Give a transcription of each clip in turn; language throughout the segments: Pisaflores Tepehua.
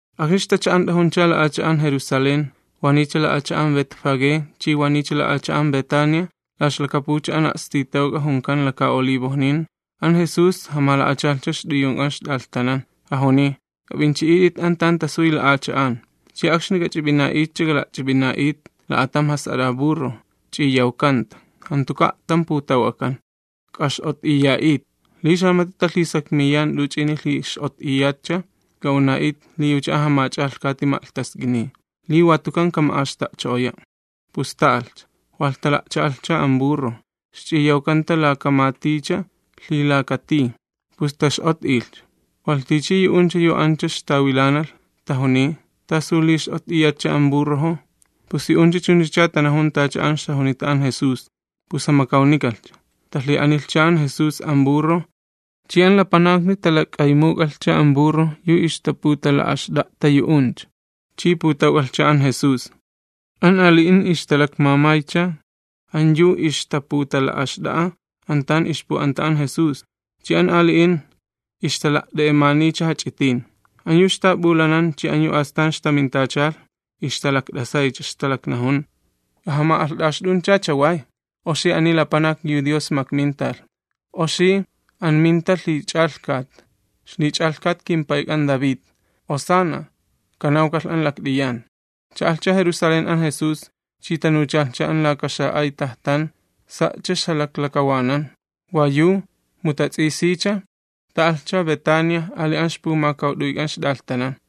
Akxni ixtacha'ant'ajuncha la'acha'an Jerusalén, wa niycha la'acha'an Betfagé chi wa niycha la'acha'an Betania, la ixlakapucha an a'stitawk'a junkan Laka Olivojnin, an Jesús jamala'achalhcha ixt'uyunk'an ixt'alhtanan. Jajuniy: ―K'ap'inchi'it'it an tan tasuy la'acha'an, chi akxni k'ach'ip'ina'itcha k'ala'ch'ip'ina'it'it la'atam jas'at'a burro, ch'iyawkanta, jantuka' a'tam putawk'akan, k'ax'ot'iya'it, akilalhiminiyaw. Li xamati talhisakmiyan t'uch'ini lhix'ot'iyatcha, k'a'una'it'it li yucha an jamach'alhkati ma'lhtask'iniy, li wa tukan kama'axta'cho'oya'. Pus ta'alhcha, walh tala'cha'alhcha an burro, ixch'iyawkanta laka maticha lhilaka tij, pus tax'ot'ilhcha. Walh tichi yu'uncha yu ancha ixtawilanalh tajuniy: ―¿Tasu li x'ot'iyatcha an burrojo? Pus yu'uncha chunchacha tanajun tacha an ixjajunita an Jesús, pus jamakawnikalhcha. Talhi'anilhcha an Jesús an burro chi an lapanakni talak'aymuk'anilhcha an burro yu ixtaputala'axt'a'ta yu'uncha, chi putawk'alhcha an Jesús. An ali'in ixtalakmamaycha an yu ixtaputala'axt'a'a an tan ixpu'anta an Jesús, chi an ali'in ixtala't'e'emaniycha jach'itin. An yu ixtap'ulanan chi an yu astan ixtamintachalh ixtalakt'asaycha, ixtalaknajun: ―¡K'ajama'alht'axt'uncha chaway! ¡Oxi ani lapanak yu Dios makmintalh! ¡Oxi an minta lhich'alhkat, ixlich'alhkat kimpayk'an David! ¡Hosanna kanawkalhi an lakt'iyan! Cha'alhcha Jerusalén an Jesús chi tanuchalhcha an laka xa'ay tajtan, sa'cha ixjalaklakawanan wa yu, mu tats'isiycha, ta'alhcha Betania ali an ixpumakawt'uyk'an ixt'alhtanan.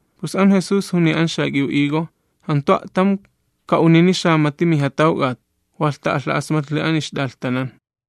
Pus an Jesús juniy an xak'iw higo: ―Jantu a'tam ka'unini xamati mijatawk'at. Walh ta'alha'asmatlhi an ixt'alhtanan.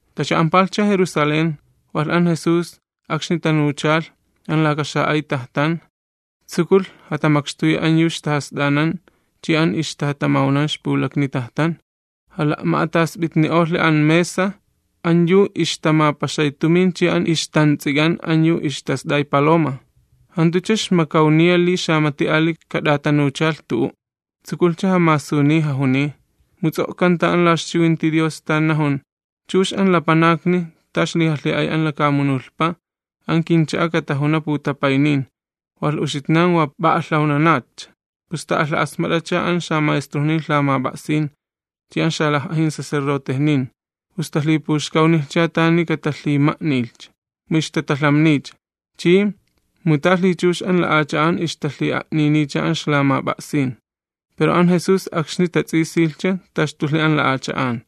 Tacha'ampalhcha Jerusalén, walh an Jesús akxni tanuchalh an laka xa'ay tajtan, tsukulh jatamakxtuyi an yu ixtajast'anan chi an ixtajatamawnan ixpulakni tajtan. Jala'ma'atasp'itni'olhi an mesa an yu ixtamapaxay tumin chi an ixtants'ik'an an yu ixtast'ay paloma. Jantucha ixmakawniya li xamati ali kat'atanuchalh tu'u'. Tsukulhcha jamasuniy jajuniy: ―Mu ts'o'kanta an la ixchiwinti Dios tan najun: “Chux an lapanakni ta ixlijalhi'ay an lakamunulhpa an kincha'a katajuna putapaynin.” Walh uxitnan wa p'a'alhawnanatcha. Pus ta'alha'asmat'acha an xamaestrojnin lhamap'a'sin chi an xalaj'ajin sacerdotejnin. Pus talhipuxkawnilhcha tani katalhima'nilhcha, mu ixtatalhamnicha chi, mu ta lhichux an lapanakni ixtalhi'a'niniycha an ixlamap'a'sin. Pero an Jesús akxni tats'isilhcha taxtulhi an la'acha'an.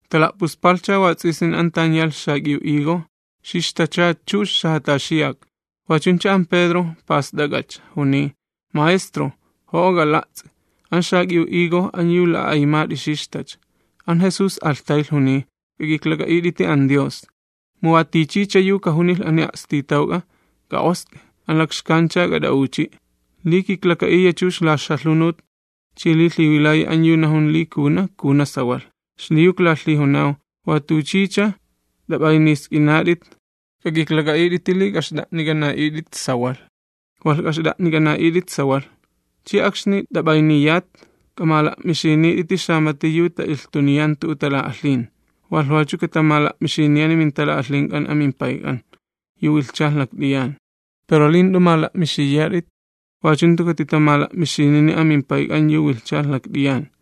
Tala'puspalhcha wats'isin an tan yalh xak'iw higo, xixtacha chux xajataxiyak. Wachuncha an Pedro past'ak'ach'a, juniy: ―Maestro, jo'o k'ala'ts'i, an xak'iw higo an yu la'a'aymat'i xixtacha. An Jesús alhtaylh juniy: ―K'ak'iklak'a'it'iti an Dios. Mu wa tichicha yu kajunilh ani a'stitawk'a: “K'a'ost'i, an alamalhch'a k'at'a'uchi'”, li kiklaka'iya chux la ixjalhunut chi li lhiwilayi an yu najun li kajuna, kajuna sawalh. Xliyu klalhijunaw, wat'uch'ich'a t'ap'aynisk'inat'it, k'ak'iklak'a'it'iti li k'axt'a'nik'ana'it'it sawalh, walh k'axt'a'nik'ana'it'it sawalh. Ch'i akxni t'ap'ayniyat, k'amala'mixinit'iti xamati yu ta'ilhtuniyan tu'u tala'alhin, walh wachu katamala'mixiniyani mintala'alhink'an an mimPayk'an yu wilhchalh lakt'iyan. [ Pero li jant'u mala'mixiyat'it, wachu jantu katitamala'mixinini an mimPayk'an yu wilhchalh lakt'iyan.]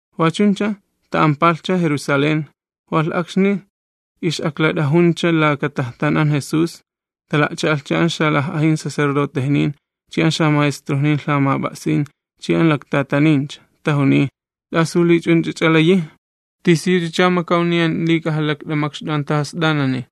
Wachuncha ta'ampalhcha Jerusalén, walh akxni ix'aklat'ajuncha laka tajtan an Jesús, tala'cha'alhcha an xalaj'ajin sacerdotejnin chi an xamaestrojnin lhamap'a'sin chi an laktatanin. Tajuniy: ―¿T'asu li ch'unch'ach'a layi, tisiyuchacha makawniyan li k'ajalakt'amakxt'u an tajast'anani?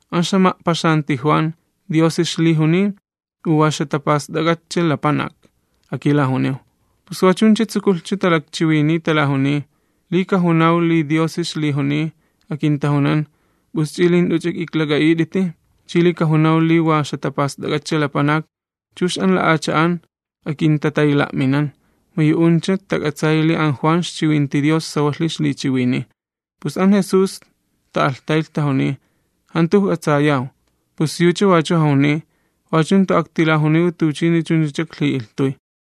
¿An ixjama'paxanti Juan, Diosi ixlijuniy u wa ixjatapast'ak'atcha lapanak? Akilajuniw. Pus wachuncha tsukulhcha talakchiwiniy talajuniy: ―Li kajunaw li Diosi ixlijuniy, akintajunan: “¿P'us ch'i li jant'uch'a k'iklak'a'it'iti?” Chi li kajunaw li wa ixjatapast'ak'atcha lapanak, chux an lapanakni akintatayla'minan, mu yu'uncha tak'atsayi li an Juan ixchiwinti Dios sawalhi ixlichiwiniy. Pus an Jesús ta'alhtaylh tajuniy: ―Jantu ijk'atsayaw. Yucha wachu jajuniy: ―Wachu jantu aktilajuniwi tuchini chunchacha iklhi'ilhtuy.